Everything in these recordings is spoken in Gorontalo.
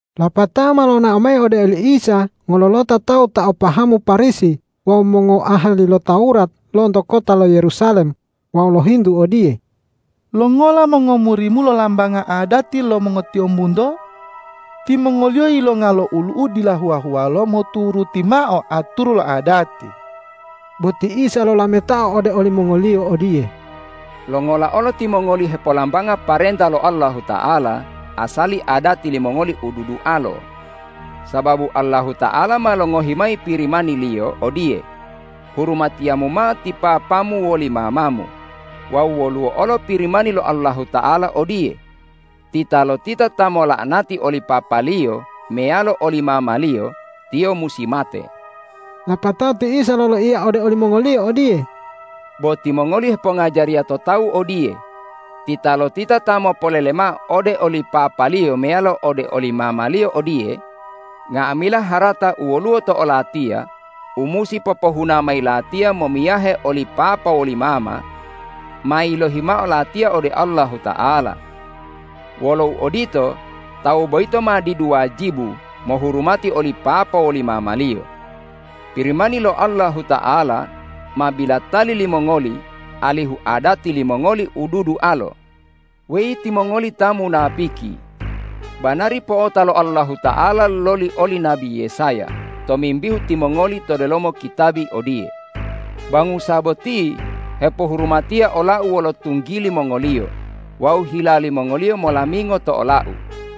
Lapatao ma lonao mayi ode oli Isa ngololota tawu ta o pahamu Parisi wawu mongoahali lo Tawurat lonto kota lo Yerusalem wawu lohintu odiye, ”Longola mongomuri-Mu lolambanga adati lo mongotiyombunto? Timongoliyo yilonga lo olu'u dila huwa-huwalo moturuti mao aturu lo adati.” Bo ti Isa lolametao ode olimongoliyo odiye,”Longola olo timongoli hepolambanga parenta lo Allahuta'ala asali adati limongoli u dudualo? Sababu Allahuta'ala ma longohi mayi Pirimani-Liyo odiye, ’Hurumatiyamu mao ti papamu woli mamamu.’ Wawu woluwo olo Pirimani lo Allahuta'ala odiye, ’Titalotita ta mola'anati oli papaliyo meyalo oli mamaliyo, tiyo musi mate.’” Lapatao ti Isa loloiya ode olimongoliyo odiye,”Bo timongoli hepongajariya to tawu odiye, ’Titalotita ta mopolele mao ode oli papaliyo meyalo ode oli mamaliyo odiye: Nga'amila harata u woluwo to olatiya u musi popohuna mayi latiya momiyahe oli papa woli mama, ma yilohi mao latiya ode Allahuta'ala.’ Wolo uodito, tawu boyito ma didu wajibu mohurumati oli papa woli mamaliyo. Pirimani lo Allahuta'ala ma bilatali limongoli alihu adati limongoli u dudualo. Weyi timongoli ta munapiki! Banari po'ota lo Allahuta'ala loli oli nabi Yesaya tomimbihu timongoli to delomo kitabi odiye, ’Bangusa boti hepohurumatiya ola-U wolo tunggili mongoliyo wawu hila limongoliyo molamingo to ola-U.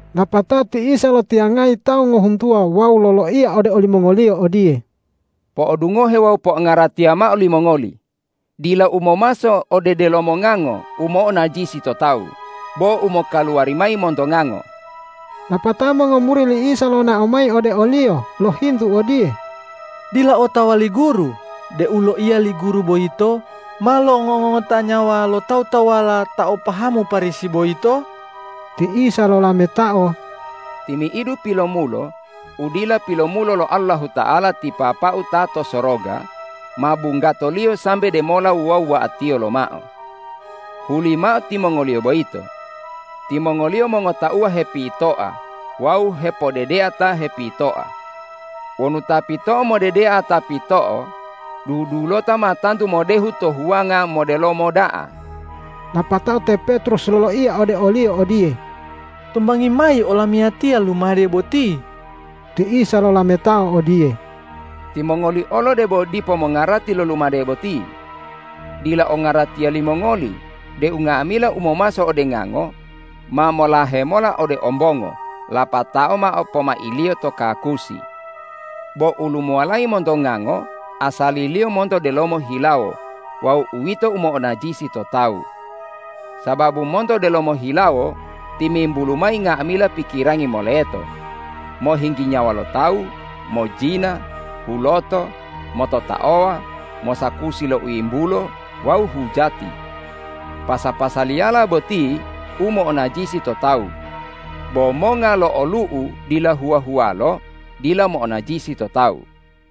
Lapatao ti Isa lotiyangayi tawu ngohuntuwa wawu loloiya ode olimongoliyo odiye,”Po'odungohe wawu po'ongaratiya mao limongoli, dila u momaso ode delomo ngango u mo'onajisi to tawu, bo u mokaluwari mayi monto ngango.” Lapatao mongomuri li Isa lonao mayi ode o-Liyo lohintu odiye,”Dila otawa li Guru deu loiya li Guru boyito ma lo'ongongota nyawa lo tawu-tawuwala ta o pahamu Parisi boyito?” Ti Isa lolametao,”Timi'idu pilomulo u dila pilomulo lo Allahuta'ala ti Papa-U ta to soroga, ma bunggato-Liyo sambe demola wuwa-wuwa'atiyo lomao. Hulimao timongoliyo boyito. Timongoliyo mongotauwa hepitoa wawu hepodedea ta hepitoa. Wonu ta pito'o modedea ta pito'o dudulota, ma tantu modehu to huwanga modelomo da'a.” Lapatao te Petrus loloiya ode o-Liyo odiye,”Tombangi mayi olamiyatiya lumade boti.” Ti Isa lolametao odiye,”Timongoli olo debo dipo mongarati lo lumade boti. Dila ongaratiya limongoli deu nga'amila u momaso ode ngango ma molahe mola ode ombongo lapatao mao pomailiyo to kakusi? Bo u lumuwalayi monto ngango asaliliyo monto delomo hilawo wawu uwito u mo'onajisi to tawu. Sababu monto delomo hilawo timimbulu mayi nga'amila pikirangi moleto, mohinggi nyawa lo tawu, mojina, huloto, mototaowa, mosakusi lo u yimbulo wawu hujati. Pasa-pasaliyala boti u mo'onajisi to tawu. Bo monga lo olu'u dila huwa-huwalo dila mo'onajisi to tawu.”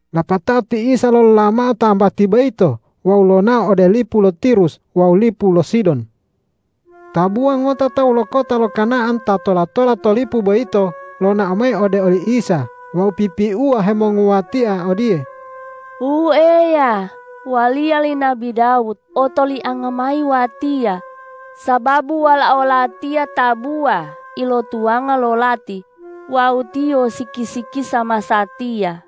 Lapatao ti Isa lolola mao tambati boyito wawu lonao ode lipu lo Tirus wawu lipu lo Sidon. Tabuwa ngota tawu lo kota lo Kana'an ta tola-tola to lipu boyito lonao mayi ode oli Isa wawu pipiuwa hemonguwatia odiye,”Wu Eya, waliya li nabi Dawud otolianga mayi watiya, sababu walao latiya tabuwa ilotuwanga lo lati wawu tiyo siki-sikisa masatiya.”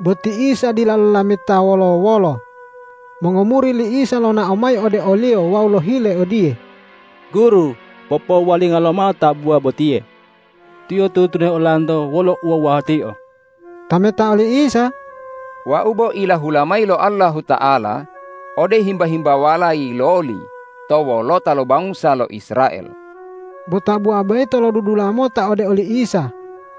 Bo ti Isa dila lolameta wolo-wolo. Mongomuri li Isa lonao mayi ode o-Liyo wawu lohile odiye,”Guru, popowuwalinga lomao tabuwa botiye. Tiyo tunu-tunuhe olanto wolo uwuwa-wuwatio.” Tametao li Isa,”Wau bo ilahula mayi lo Allahuta'ala ode himba-himbawala yiloli to wolota lo bangusa lo Israel.” Bo tabuwa boyito lodudula mota ode oli Isa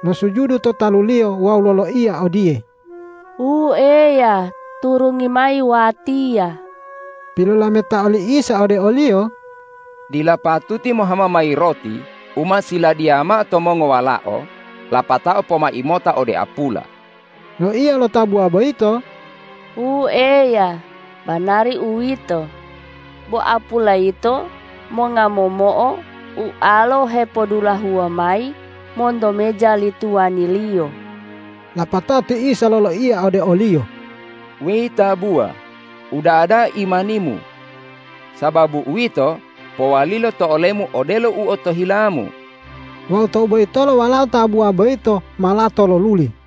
losujudu to talu-Liyo wawu loloiya odiye,”Wu Eya, turungi mayi watiya.” Pilolametao li Isa ode oliyo,”Dila patuti mohama mayi roti u ma siladiya mao to mongowalao lapatao pomai mota ode apula.” Loiya lo tabuwa boyito,”Wu Eya, banari uwito, bo apula yito monga momo'o ualo hepodulahuwa mayi monto meja li tuwaniliyo.” Lapatao ti Isa loloiya ode oliyo,”Weyi tabuwa, uda'a da'a imanimu! Sababu uwito, powalilo to olemu odelo u otohilamu.” Wawu tou boyitolo walao tabuwa boyito ma lato loluli.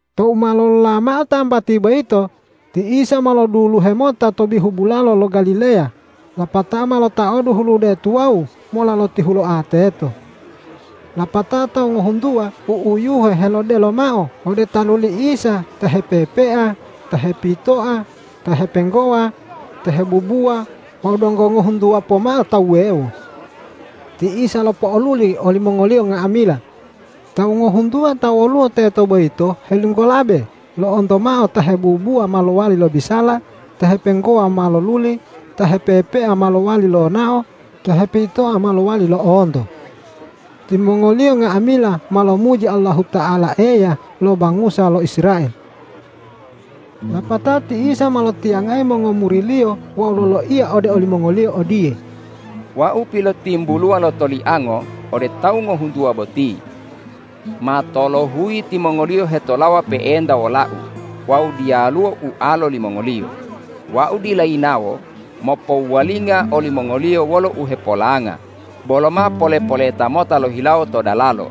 Tou ma lolola mao tambati boyito, ti Isa ma loduluhe mota to bihu bulalo lo Galileya lapatao ma lotaodu hulude tuwawu mola lotihuloa teto. Lapatao tawu ngohuntuwa u'uyuhe helodelo mao ode talu li Isa ta hepepea, ta hepitoa, ta hepenggowa, ta hebubuwa wawu donggo ngohuntuwa pomao tawu wuwewo. Ti Isa lopo'oluli olimongoliyo nga'amila. Tawu ngohuntuwa ta woluwo teto boyito helinggolabe lo'onto mao ta hebubuwa ma lowali lobisala, ta hepenggowa ma loluli, ta hepepea ma lo'owali lonao, ta hepitoa ma lowali lo'onto. Timongoliyo nga'amila ma lomuji Allahuta'ala Eya lo bangusa lo Israel. Lapatao ti Isa ma lotiyangayi mongomuri-Liyo wawu loloiya ode olimongoliyo odiye,”Wau pilotimbuluwa lotoliango ode tawu ngohuntuwa boti. Ma tolohuyi timongoliyo hetolawa pe'enta wola-U wawu diyaluwo ualo limongoliyo. Wau dila yinawo mopowuwalinga olimongoliyo wolo uhepolanga, bolo ma pole-poleta mota lohilawo to dalalo.”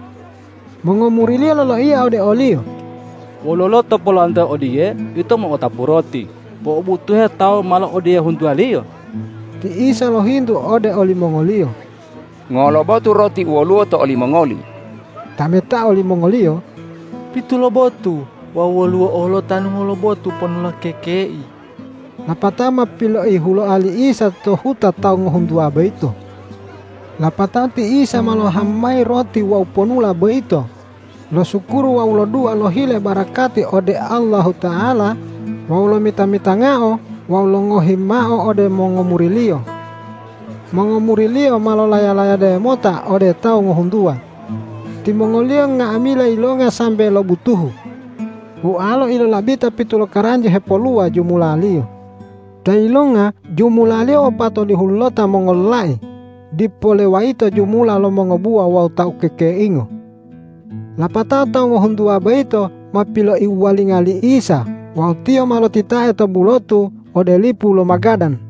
Mongomuri-Liyo loloiya ode o-Liyo,”Wololo to polowantoa odiye ito mo'otapu roti po'obutuhe tawu malo odiye huntuwaliyo?” Ti Isa lohintu ode olimongoli,”Ngolo botu roti u woluwo to olimongoli?” Tametao limongoliyo,”Pitu lobotu wawu woluwo olo tanu ngolobotu ponula kekei.” Lapatao ma piloihuloa li Isa to huta tawu ngohuntuwa boyito. Lapato ti Isa ma lohama mayi roti wawu ponula boyito losukuru wawu lodua lohile barakati ode Allahuta'ala wawu lomita-mitangao wawu longohi mao ode mongomuri-Liyo. Mongomuri-Liyo ma lolaya-layade mota ode tawu ngohuntuwa. Timongoliyo nga'amila yilonga sambe lobutuhu. Ualo ilolabita pitu lokaranji hepoluwa jumulaliyo. Ta yilonga jumulaliyo wopatolihulota mongololai dipo lewayito jumula lo mongobuwa wawu ta ukekeingo. Lapatao tawu ngohuntuwa boyito ma piloiwuwalinga li Isa wawu Tiyo ma lotitae to bulotu ode lipu lo Magadan.